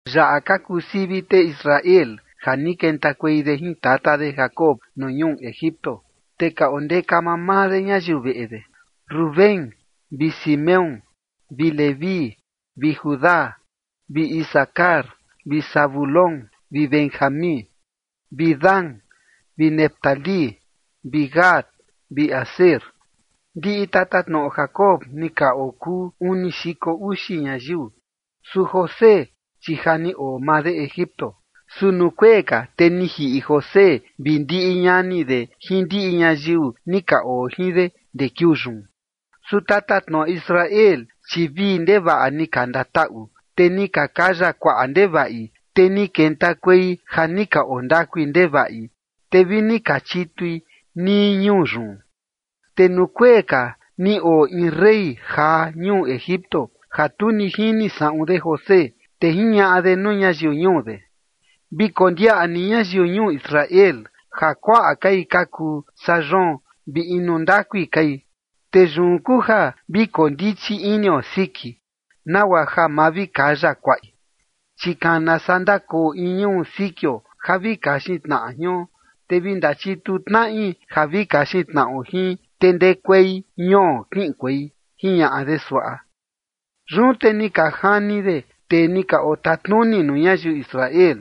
Yaꞌa ka kuu sivi tee Israel ja ni kentakuei de jin tata de Jacob nuu ñuu Egipto, te ka ondeka mamaa de ñayiu veꞌe de: Rubén, vi Simeón, vi Leví, vi Judá, vi Isacar, vi Zabulón, vi Benjamín, vi Dan, vi Neftalí, vi Gad vi Aser. Ndiꞌi tatatnoꞌo Jacob ni ka okuu uni xiko uxi ñayiu. Su José, chi ja ni oo maa de Egipto. Su nuu kuee ka, te ni jiꞌi José vi ndiꞌi ñani de jin ndiꞌi ñayiu ni ka oo jin de ndee kiuu yun. Su tatatnoꞌo Israel, chi vii ndevaꞌa ni ka ndataꞌu, te ni ka kaya kuaꞌa ndevaꞌi, te ni kentakuei ja ni ka oo ndakui ndevaꞌi, te vi ni ka chitui nii ñuu yun. Te nuu kuee ka ni oo in rey jaa ñuu Egipto ja tu ni jini saꞌun de José. Te jiñaꞌa de nuu ñayiu ñuu de: ―Vi kondiaꞌa ni ñayiu ñuu Israel ja kuaꞌa kai ka kuu saa yoon vi inu ndakui kai. Te yun kuu ja vi koo ndichi inio siki, nagua ja ma vi kaya kuaꞌi, chi kana saa ndakoo in ñuu sikio ja vi kaxin tnaꞌa jion, te vi ndachituu tnaꞌi ja vi kaxin tnaꞌo jin, te ndekuei ñuo kiꞌinkuei ―jiñaꞌa de suaꞌa. Yun te ni ka jani de tee ni ka otanuni nuu ñayiu Israel,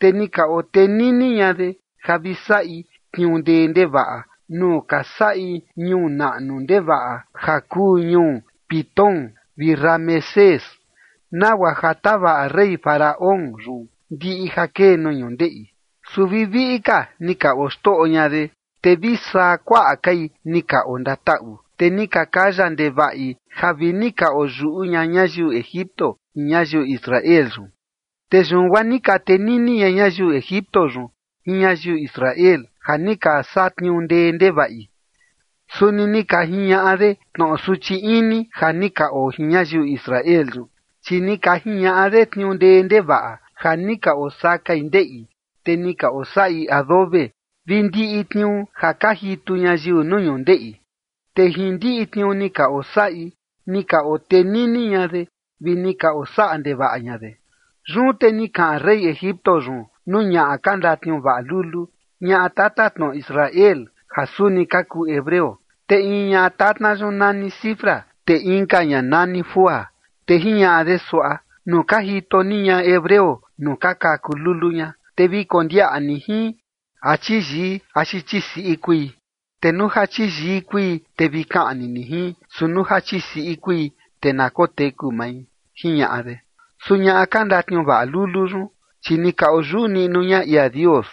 te ni ka otenini ña de ja vi saꞌi tniuu ndee ndevaꞌa nuu ni ka saꞌi ñuu naꞌnu ndevaꞌa ja kuu ñuu Pitón vi Ramesés, nagua ja tavaꞌa rey Faraón yun ndiꞌi ja kee nuu ñundeꞌi. Su vi viꞌi ka ni ka oxtoꞌo ña de, te vi saa kuaꞌa kai ni ka ondataꞌu. Te ni ka kaya ndevaꞌi ja vi ni ka oyuꞌu ña ñayiu Egipto jin ñayiu Israel yun. Te yun guaa ni ka tenini ña ñayiu Egipto yun jin ñayiu Israel ja ni ka satniuu ndee ndevaꞌi. Suni ni ka jiñaꞌa de tnoꞌo suchi ini ja ni ka oo jin ñayiu Israel yun, chi ni ka jiñaꞌa de tniuu ndee ndevaꞌa ja ni ka osakai ndeꞌi, te ni ka osaꞌi adobe, vi ndiꞌi tniuu ja ka jitu ñayiu nuu ñundeꞌi. Te jin ndiꞌi tniuu ni ka osaꞌi ni ka otenini ña de vi ni ka osaꞌa ndevaꞌa ña de. Yun te ni kaꞌan rey Egipto yun nuu ñaꞌa ka ndatniuvaꞌa lulu, ñaꞌa tatatnoꞌo Israel, ja suni ka kuu hebreo. Te in ñaꞌa tatna yun nani Sifra, te inka ña nani Fúa, te jiñaꞌa de suaꞌa: ―Nuu ka jito ni ñaꞌa hebreo nuu ka kaku lulu ña, te vi kondiaꞌa ni jin, a chiyii axi chisiꞌi kui. Te nuu ja chiyii kui, te vi kaꞌni ni jin, su nuu ja chisiꞌi kui, te na koteku mai ―jiñaꞌa de. Su ñaꞌa ka ndatniuvaꞌa lulu yun, chi ni ka oyuꞌu niꞌnu ña ia Dios,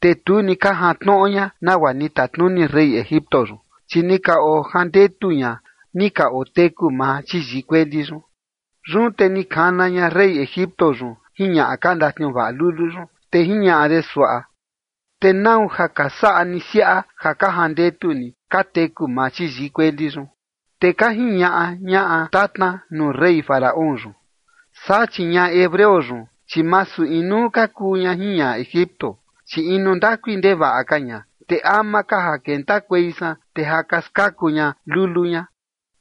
te tu ni ka jantnoꞌo ña nagua ni tatnuni rey Egipto yun, chi ni ka ojandetu ña ni ka oteku maa chiyii kueli yun. Yun te ni kana ña rey Egipto yun jin ñaꞌa ka ndatniuvaꞌa lulu yun, te jiñaꞌa de suaꞌa: ―¿Te nau ja ka saꞌa ni siaꞌa ja ka jandetu ni ka teku maa chiyii kueli yun? Te ka jiñaꞌa ñaꞌa tatna nuu rey Faraón yun: ―Saa, chi ñaꞌa hebreo yun, chi masu inuu ka kuu ña jin ñaꞌa Egipto, chi inu ndakui ndevaꞌa ka ña, te ama ka ja kentakuei san, te ja ka skaku ña lulu ña.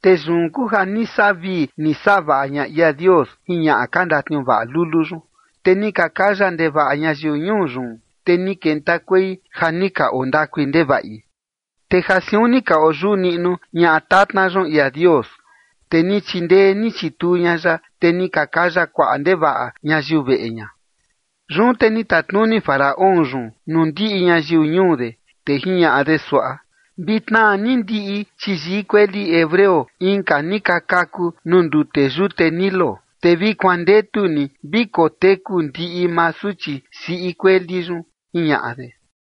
Te yun kuu ja ni saꞌa vii ni saꞌa vaꞌa ña ia Dios jin ñaꞌa ka ndatniuvaꞌa lulu yun, te ni ka kaya ndevaꞌa ñayiu ñuu yun, te ni kentakuei ja ni ka oo ndakui ndevaꞌi. Te ja siun ni ka oyuꞌu niꞌnu ñaꞌa tatna yun ia Dios, te ni chindee ni chituu ña ya, te ni ka kaya kuaꞌa ndevaꞌa ñayiu veꞌe ña. Yun te ni tatnuni Faraón yun nuu ndiꞌi ñayiu ñuu de, te jiñaꞌa de suaꞌa: ―Vi tnaa ni ndiꞌi chiyii kueli hebreo inka ni ka kaku nuu ndute yute Nilo, te vi kuandetu ni vi koteku ndiꞌi maa suchi siꞌi kueli yun ―jiñaꞌa de.